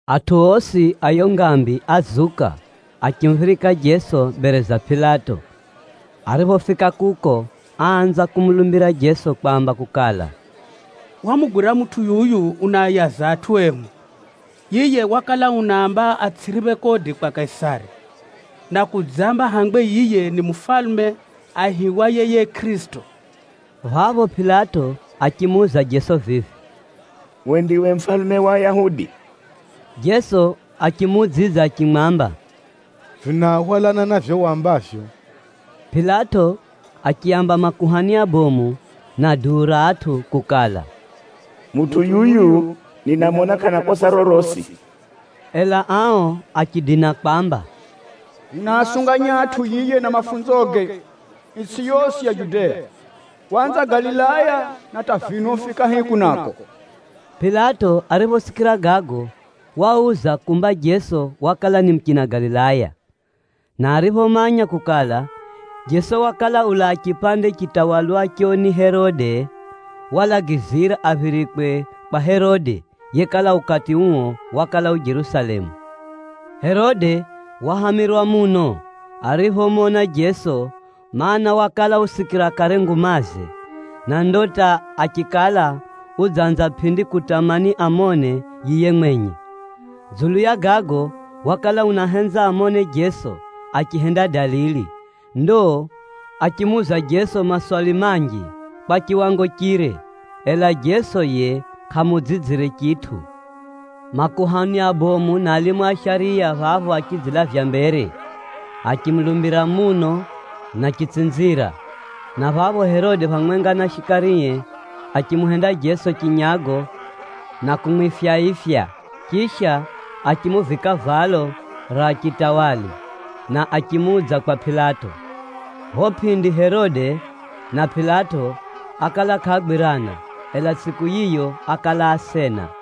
Atʼu osi a yiyo ngambi ázuka achimuphirika Jeso mbere za Pilato. Ariphofika kuko, áanza kumulumbira Jeso kwamba kukala, “Hwamugwira mutʼu yuyu unaayaza atʼu ehu. Yiye wakala unaamba atsʼiriphe kodi kwa Kaisari, na kudzamba hangwe yiye ni mufalume aihiwaye yiye Kʼirisito.” Phapho Pilato achimuuza Jeso vivi, “Uwe ndiwe mufalume wa Ayahudi?” Jeso achimuudzidza achimwamba, “Vinahwalana na vivyo wambavyo.” Pilato achiaamba makuhani abomu na duu ra atʼu kukala, “Mutʼu yuyu ninamona kʼana kosa rorosi.” Ela ao achidina kwamba, “Unaasunganya atʼu yiye na mafunzoge itsʼi yosi ya Judea. Waanza Galilaya na hata vino ufika hiku nako.” Pilato ariphosikira gago wauza kumba Jeso wakala ni muchina Galilaya. Na ariphomanya kukala, Jeso wakala ulaa chipande chitawalwacho ni Herode, walagizira aphirikwe kwa Herode yekala ukati uo wakala u Jerusalemu. Herode wahamirwa muno ariphomona Jeso, mana, wakala usikira kare ngumaze, na ndo hata achikala udzanza pʼindi kutamani amone yiye mwenye. Dzulu ya gago, wakala unahenza amone Jeso achihenda dalili. Ndo achimuuza Jeso maswali manji kwa chiwango chire, ela Jeso yiye kʼamuudzidzire chitʼu. Makuhani abomu na alimu a shariya phapho achidzilavya mbere, achimulumbira muno na chitsinzira. Na phapho Herode phamwenga na shikarie achimuhenda Jeso chinyago na kumwifya-ifya, chisha achimuvika valo ra chitawali na achimuudza kwa Pilato. Phapho pʼindi Herode na Pilato ákala kʼaagwirana, ela tsʼiku yiyo ákala asena.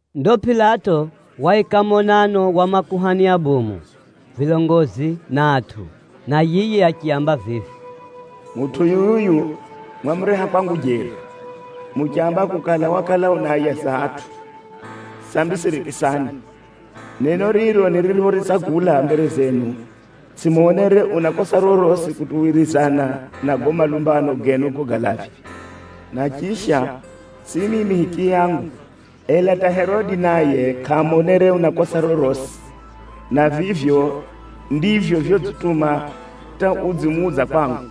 Ndo Pilato waika monano wa makuhani abomu, vilongozi na atʼu, na yiye achiaamba vivi, “Mutʼu yuyu mwamureha kwangu jeri, muchamba kukala wakala unaayaza atʼu. Sambi sirikisani! Neno riro niriphoritsagula mbere zenu, tsʼimonere una kosa rorosi kutuwirizana na gago malumbano genu gogalavya. Na chisha, tsʼi mimi hichiyangu, ela hata Herode naye kʼamonere una kosa rorosi, na vivyo ndivyo vyodzituma hata udzimuudza kwangu.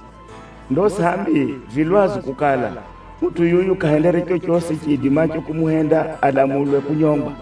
Ndo sambi vi lwazu kukala, mutʼu yuyu kʼahendere chochosi chiidimacho kumuhenda alamulwe kunyongwa.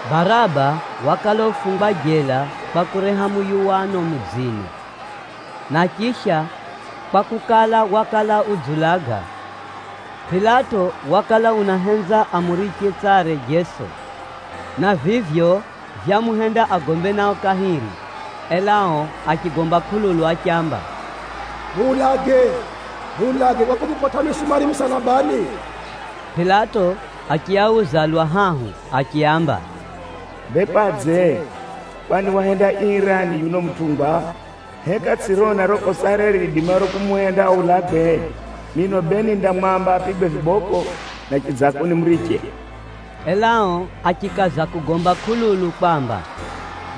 (Baraba wakala ufungwa jela kwa kureha muyuwano mudzini, na chisha kwakukala, wakala udziulaga.) Pilato wakala unahenza amuriche tsare Jeso, na vivyo vyamuhenda agombe nao kahiri, ela ao achigomba kʼululu achiamba, “Muulage, muulage kwa kumukotʼa misumari musalabani!” Pilato achiauza lwa hahu achiaamba, “Bee kwadze? Kwani wahenda ii rani yuno mutʼungwa? Heka tsʼirona riro kosare riidimaro kumuhenda aulagwe? Mino bee nindamwamba apigwe vibokʼo na chidzako nimuriche.” Ela ao achikaza kugomba kʼululu kwamba,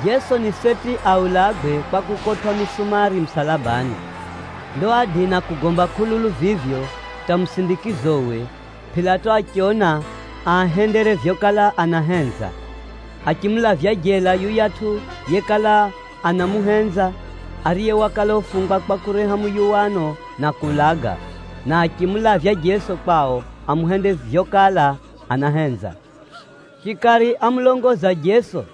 Jeso ni seti aulagwe kwa kukotwʼa misumari musalabani. Ndo ádina kugomba kʼululu vivyo hata musindikizowe, Pilato achiona aahendere vyokala anahenza. Achimulavya jela yuyatʼu yekala anamuhenza, ariye wakala ufungwa kwa kureha muyuwano na kuulaga, na achimulavya Jeso kwao amuhende vyokala anahenza. Shikari ámulongoza Jeso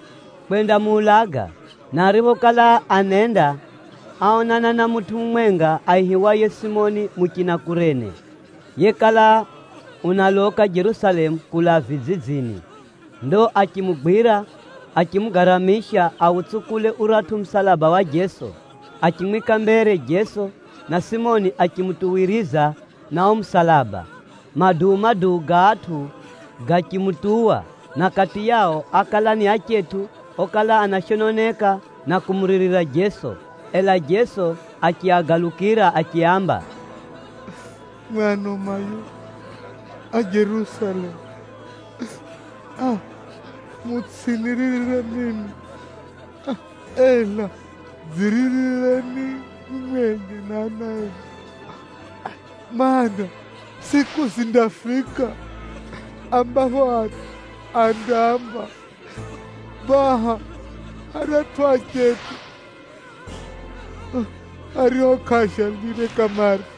kwendamuulaga, na ariphokala anenda, áonana na mutʼu mumwenga aihiwaye Simoni muchina Kurene, yekala unaloka Jerusalemu kulaa vidzidzini. Ndo achimugwira, achimugaramisha autsukule uratʼu musalaba wa Jeso. Achimwika mbere Jeso, na Simoni achimutuwiriza na uo musalaba. Maduu-maduu ga atʼu gachimutuwa, na kati yao ákala ni achetʼu okala anashononeka na kumuririra Jeso. Ela Jeso achiagalukira achiaamba, “Mwimwi ano mayo a Jerusalemu! Mutsʼiniririre mimi, ela dziririreni mwimwi enye na ana enu. Maana, tsʼiku zindafika ambapho atʼu andaamba, ‘Baha aratʼu achetʼu ario kʼaavyalire kamare!’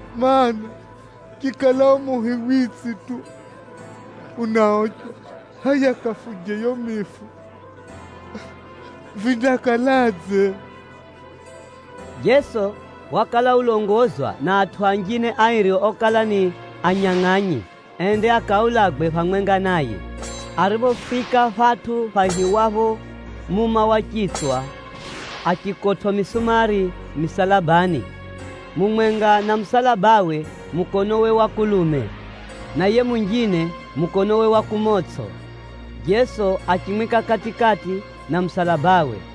Maana, chikala o muhi witsi tu unaochwa, hʼaya kafuje yiyo mifu vindakaladze?” Jeso wakala ulongozwa na atʼu anjine airi okala ni anyangʼanyi, ende akaulagwe phamwenga naye. Ariphofika phatʼu phaihiwapho, “Muma wa Chitswa,” achikotwʼa misumari misalabani. Mumwenga na musalabawe mukonowe wa kulume, na yiye munjine mukonowe wa kumotsʼo. Jeso achimwika kati-kati na musalabawe.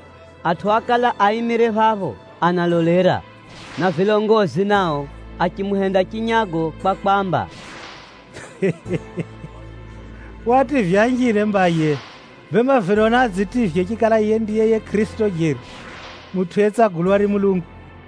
Atʼu ákala aimire phapho analolera, na vilongozi nao achimuhenda chinyago kwa kwamba, “Waativya anjine mba yiye, bemba vino naadzitivye chikala yiye ndiye yiye Kʼirisito jeri, mutʼu yetsagulwa ni Mulungu!”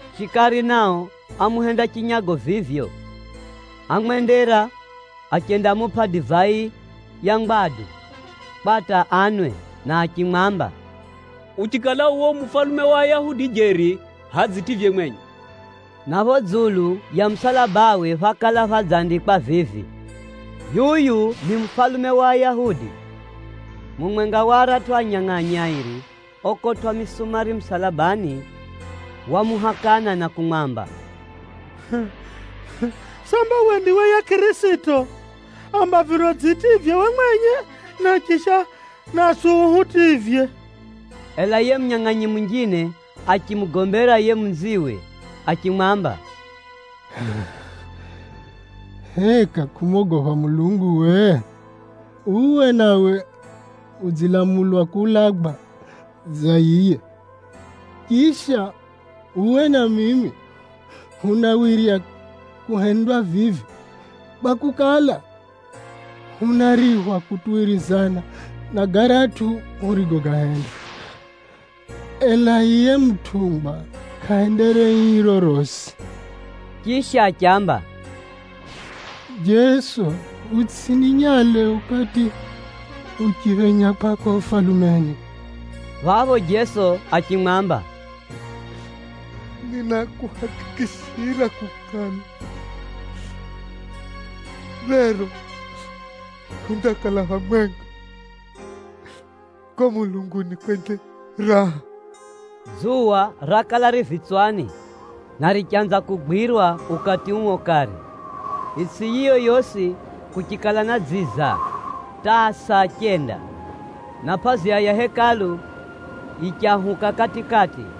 Shikari nao ámuhenda chinyago vivyo. Ámwendera achendamupʼa divai ya ngwadu kwa hata anwe na achimwamba, “Uchikala uwe u mufalume wa Ayahudi jeri, hʼaya dzitivye mwenye.” Na phapho dzulu ya musalabawe phákala phadzandikwa vivi, “yuyu ni mufalume wa ayahudi. Mumwenga wa aratʼu anyangʼanyi airi okotwʼa misumari musalabani wamuhakana na kumwamba, “Samba uwe ndiwe yiye Kʼirisito? Amba vino dzitivye uwe mwenye, na chisha naswi uhutivye.” Ela yiye munyangʼanyi munjine achimugombera yiye munziwe achimwamba, “Heka kʼumogopha Mulungu uwe? Uwe nawe udzilamulwa kuulagwa dza yiye! Chisha, uwe na mimi hunawirya kuhendwa vivi, kwakukala, hunariphwa kutuwirizana na garatʼu hurigogahenda. Ela yiye mutʼungwa kʼahendere ii rorosi.” Chisha achiamba, “Jeso, utsʼininyale ukati uchiphenya kwako Ufalumeni.” Phapho Jeso achimwamba, “Ninakuhakikishira kukala, rero hundakala phamwenga kuko mulunguni kwenye raha.” Dzuwa rakala ri vitswani, na richanza kugwirwa ukati uo kare. Itsʼi yiyo yosi kuchikala na dziza hata saa chenda, na pʼaziya ya Hekalu yichahuka kati-kati.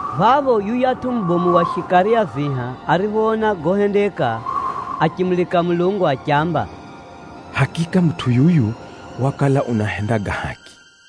Phapho yuyatʼu mubomu wa shikari a viha ariphoona gohendeka, achimulika Mulungu achiamba, “Hakika mutʼu yuyu wakala unahenda ga haki.”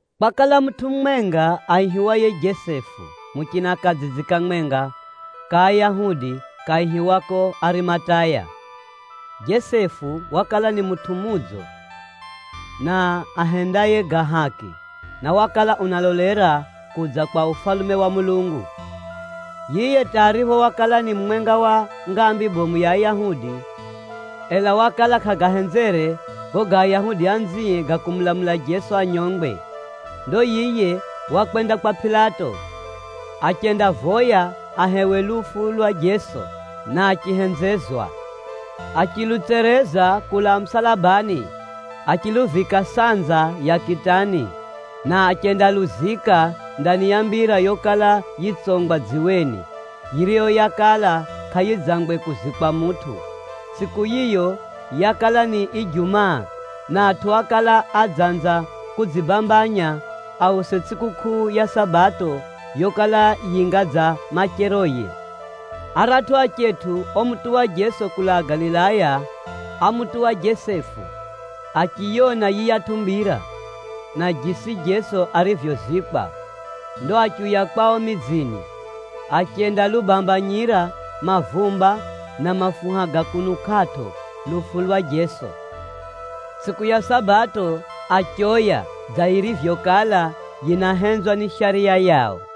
Kwakala mutʼu mumwenga aihiwaye Jesefu muchina kadzidzi kamwenga ka Ayahudi kaihiwako Arimataya. Jesefu wakala ni mutʼu mudzo na ahendaye ga haki, na wakala unalolera kudza kwa Ufalume wa Mulungu. Yiye hata aripho wakala ni mumwenga wa ngambi bomu ya Ayahudi, ela wakala kʼagahenzere gago ga Ayahudi anzie ga kumulamula Jeso anyongwe. Ndo yiye wakwenda kwa Pilato, achendavoya ahewe lufu lwa Jeso, na achihenzezwa. Achilutsereza kulaa musalabani, achiluvika sanza ya kitani, na achendaluzika ndani ya mbira yokala yitsongwa dziweni, yiriyo yakala kʼayidzangwe kuzikwa mutʼu. Tsʼiku yiyo yakala ni Ijumaa, na atʼu ákala adzanza kudzibambanya ause tsʼikukʼuu ya Sabato yokala yinga dza macheroye. Aratʼu achetʼu omutuwa Jeso kulaa Galilaya ámutuwa Jesefu, achiyona yiyatʼu mbira, na jisi Jeso arivyozikwa. Ndo achiuya kwao midzini, achendalubambanyira mavumba na mafuha ga kunukʼatʼo lufu lwa Jeso. Tsʼiku ya Sabato achoya dza yirivyokala yinahenzwa ni Shariya yao.